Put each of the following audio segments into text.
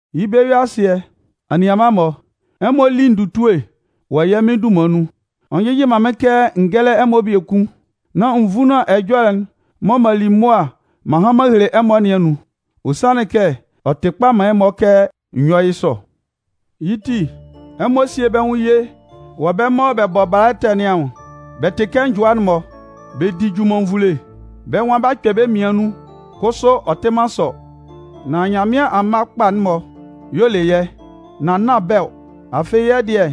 Yɩ́ bɛ-yue-asɩɛ, anianman-mɔ, ɛmɔ lí ndutue wɔ yɛ́ Mɩn dunman nun. Ɔ njɩjɩ man mɩ́n kɛ n gɛ́lɛ ɛmɔ biekun nán n vúnlan ɛjɔlɛ'n mɔ m'an li mʋa m'an han m'an hele ɛmɔ nɩn anun. Ɔ sanlɩn kɛ ɔ tɩ kpa man ɛmɔ kɛ n yɔ́ yɩ́ sɔ. Yɩ́ ti, ɛmɔ síe bɛ́ nwʋn ye wɔ bɛ́ mɔ bɛ bɔ bala ɛtɛ nɩn anwʋn. Bɛ tɩ kɛ njʋa-mɔ, bɛ di junmannvule, bɛ́ nwan b'a kpɛ bɛ́ mmian nun, kʋsʋ ɔ tɩ man sɔ. Nan Nyanmɩan amma kpa'n-mɔ y'ɔ le yɛ́, nan nán bɛ́ ɔ. Afɩ, yɛ́ dɩɛ,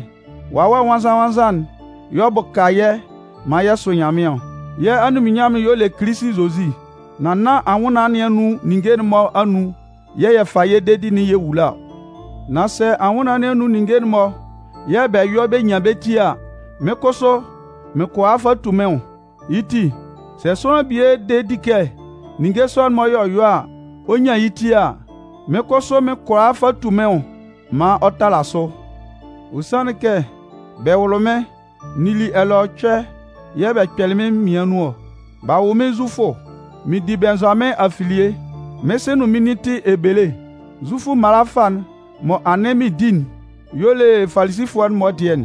Wawɛ Nwannzan-nwannzan'n y'ɔ bʋka yɛ́ maan yɛ sʋ Nyanmɩan ɔ. Yɛ́ anunminnyanmʋn'n y'ɔ le Kilisi Zozi, nan nán anwʋnnaan nɩn anun ninnge'n-mɔ anun yɛ̂ yɛ fa yɛ́ dedi'n yɛ wula ɔ. Nan sɛ anwʋnnaan nɩn anun ninnge'n-mɔ yɛ̂ bɛ yɔ bɛ nyan bɛ ti a, mɩ́n kʋsʋ mɩn kʋala fa tu mɩ́n nwʋn. Yɩ́ ti, sɛ sʋanlan bie de di kɛ ninnge sɔ'n-mɔ y'ɔ yɔ a, ɔ nyan yɩ́ ti a, mɩ́n kʋsʋ mɩn kʋala fa tu mɩ́n nwʋn maan ɔ tala sʋ. Ɔ sanlɩn kɛ bɛ wʋlɩ mɩ́n n nili ɛlɛɔcʋɛ yɛ̂ bɛ kpɛlɩ mɩ́n mmian nun ɔ. B'a wʋ mɩ́n Zufʋ. Mɩn di Bɩnnzʋamɩn afilie. Mɩ́n sɩ nʋn mɩ́n nin tɩ Ebele. Zufʋ mala fâ'n mɔ anɩn mɩn di'n y'ɔ le Falisifʋɛ'n-mɔ dɩɛ'n.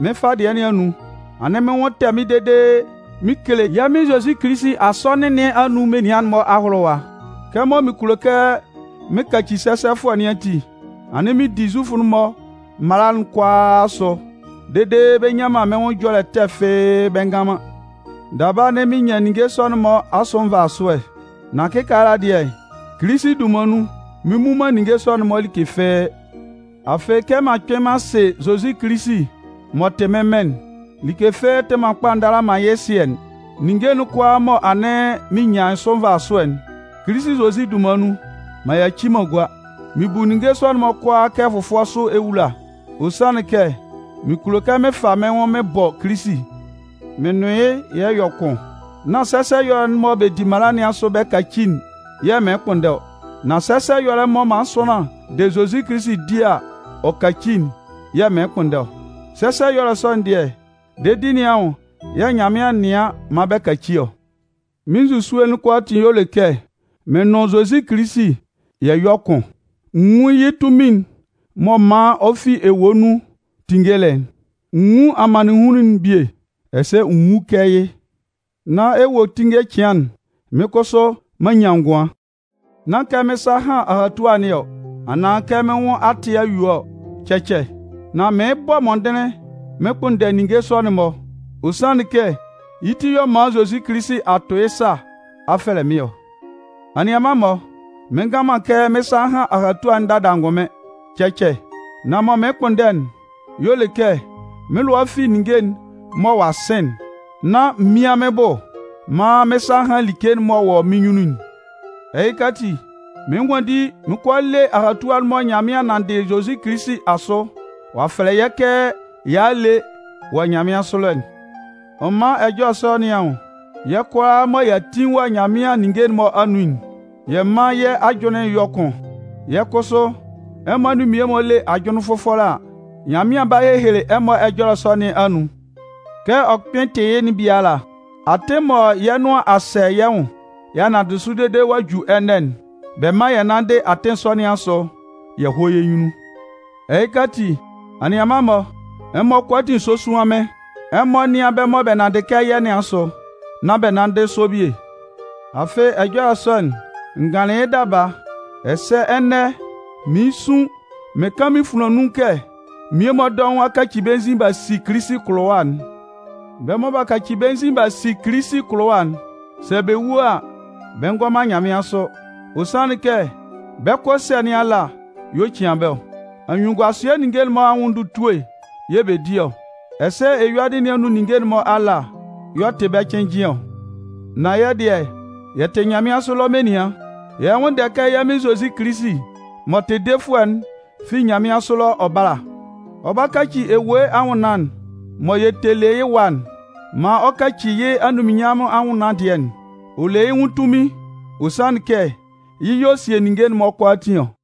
Mɩ́n fâ dɩɛ nɩn anun, anɩn mɩ́n nwʋn tɛ mɩ́n dede mɩn kele yɛ́ Mɩn Zozi Kilisi Asɔnɩn nɩn anun menian'n-mɔ ahʋlʋwa. Kɛmɔ mɩn kulo kɛ mɩn kaci sɛsɛfʋɛ nɩn ati, anɩn mɩn di Zufʋ'n-mɔ mala'n kʋalaa asʋ dede bɛ nyan man mɩ́n nwʋn ɛjɔlɛ ɛtɛ fɩ́ɩ́ bɛ ngan man. Daba, anɩn mɩn nyan ninnge sɔ'n-mɔ asʋ nvasuɛ. Nan kɩkaala dɩɛ, Kilisi dunman nun, mɩn mmu man ninnge sɔ'n-mɔ like fɩ́ɩ́. Afɩ, kɛ m'an kpɩn m'an sɩ Zozi Kilisi m'ɔ tɩ mɩ́n Mɩn'n, like fɩ́ɩ́ tɩ man kpa ndala man yɩ́ ɛsɩɛ'n. Ninnge'n kʋalaa mɔ anɩn mɩn nyan sʋ nvasʋɛ'n, Kilisi Zozi dunman nun, m'an yaci m'an gua. Mɩn bu ninnge sɔ'n-mɔ kʋalaa kɛ fʋfʋɛ sʋ ewula. Ɔ sanlɩn kɛ mɩn kulo kɛ mɩn fa mɩ́n nwʋn mɩn bɔ Kilisi mɩn nʋn yɩ́ yɛ yɔ kʋn. Nán sɛsɛ ɛyɔlɛ'n mɔ bɛ di mala nɩn asʋ bɛ kaci'n yɛ̂ mɩɩn kpʋnndɛ ɔ, nan sɛsɛ ɛyɔlɛ'n mɔ sʋanlan de Zozi Kilisi di a ɔ kaci'n yɛ̂ mɩɩn kpʋnndɛ ɔ. Sɛsɛ ɛyɔlɛ sɔ'n dɩɛ, dedi nɩn anwʋn yɛ̂ Nyanmɩan nɩan maan bɛ kaci ɔ. Mɩ́n nzusue'n kʋalaatin y'ɔ le kɛ mɩn nʋn Zozi Kilisi yɛ yɔ́ kʋn, n nwún yɩ́ tunmin'n m'ɔ man ɔ fi ewue nun tinngelɩ'n, n nwún amannɩnhunlun'n bie ɛsɛ n wú kɛ yɩ́ nán ewuetinnge cɩan'n, mɩ́n kʋsʋ m'an nyan ngʋan. Nán kɛ mɩ́n sa a han ahatua nɩn ɔ, anaan kɛ mɩ́n nwʋn a tɩ a yue ɔ, cɛcɛ. Nan mɩɩn bɔ mɔndɩnlɩn mɩn kpʋnndɛ ninnge sɔ'n-mɔ. Ɔ sanlɩn kɛ yɩ́ ti y'ɔ man Zozi Kilisi a tʋ yɩ́ sa a fɛlɛ mɩ́n ɔ. Anianman-mɔ, mɩn ngan man kɛ mɩ́n sa a han ahatua'n dada angʋnmɩn, cɛcɛ. Nan mɔ mɩɩn kpʋnndɛ'n y'ɔ le kɛ mɩ́n lʋa fi ninnge'n mɔ ɔ'a sɩn'n nán m mían mɩ́n bʋ maan mɩ́n sa hán like'n m'ɔ wɔ mɩ́n nyunnun'n. Ɛhɩka ati, mɩɩn nwanndi mɩn 'kɔ a le ahatua'n mɔ Nyanmɩan nanndɩ Kilisi Zozi asʋ, ɔ'a fɛlɛ yɛ́ kɛ y'a a le wɔ nyanmɩansʋ ɛlɔ'n. Ɔ man ɛjɔlɛ sɔ nɩn anwʋn, yɛ́ kʋalaa mɔ y'a tin wɔ Nyanmɩan ninnge'n-mɔ anun'n, yɛ mán yɛ́ ajʋnlɩn yɔ́ kʋn. Sɛ kʋsʋ, ɛmɔ anun mmie-mɔ le ajʋnlɩn fʋfɔlɛ a, Nyanmɩan 'ba hehele ɛmɔ ɛjɔlɛ sɔ nɩn anun. Kɛ ɔ kpɩn tɩ yɩ́'n biala, atɩn mɔ yɛ́ nʋan a sɛ yɛ nwʋn y'a nanndɩ sʋ dede ɔ'a ju ɛnɛ'n, bɛ mán yɛ nánndɩ atɩn sɔ nɩn asʋ yɛ hɔ́ yɛ́ nyunnun. Ɛhɩka ati, anianman-mɔ, ɛmɔ kʋalaatin sósuan mɩ́n. Ɛmɔ nɩ́an bɛ́ mɔ bɛ nanndɩ kɛ yɛ́ nɩn asʋ nán bɛ nánndɩ sɔ bie. Afɩ, ɛjɔlɛ sɔ'n, n ganlɩn yɩ́ daba, ɛsɛ ɛnɛ mɩɩn sun mɩn kan mɩn funlan nun kɛ mmie-mɔ dɔʋn a kaci bɛ́ nzin b'a si Kilisi kʋlʋwa'n. Bɛ́ mɔ b'a kaci bɛ́ nzin b'a si Kilisi kʋlʋwa'n, sɛ bɛ wu a, bɛ ngɔ man nyanmɩansʋ. Ɔ sanlɩn kɛ bɛ́ kʋ ɛsɛ̂ nɩn ala y'ɔ cian bɛ́ ɔ. Anyunnunguasɩɛ ninnge'n-mɔ anwʋn ndutue yɛ̂ bɛ di ɔ. Ɛsɛ eyuadɩ nɩn anun ninnge'n-mɔ ala y'ɔ tɩ bɛ́ cɩnnjɩn ɔ. Nan yɛ́ dɩɛ, yɛ tɩ nyanmɩansʋ ɛlɔ menian. Yɛ lɛ nwʋnndɛ kɛ yɛ́ Mɩn Zozi Kilisi m'ɔ tɩ Defʋɛ'n fi nyanmɩansʋ ɛlɔ ɔ bála. Ɔ 'ba kaci ewue anwʋnnaan'n mɔ yɛ tɛ le yɩ́ ɛwa'n maan ɔ yɔ kɛ yɩ́ anunminnyanmʋn anwʋnnaan dɩɛ'n. Ɔ le yɩ́ nwʋn tunmin. Ɔ sanlɩn kɛ yɩ́ y'ɔ sie ninnge'n-mɔ kʋalaatin ɔ.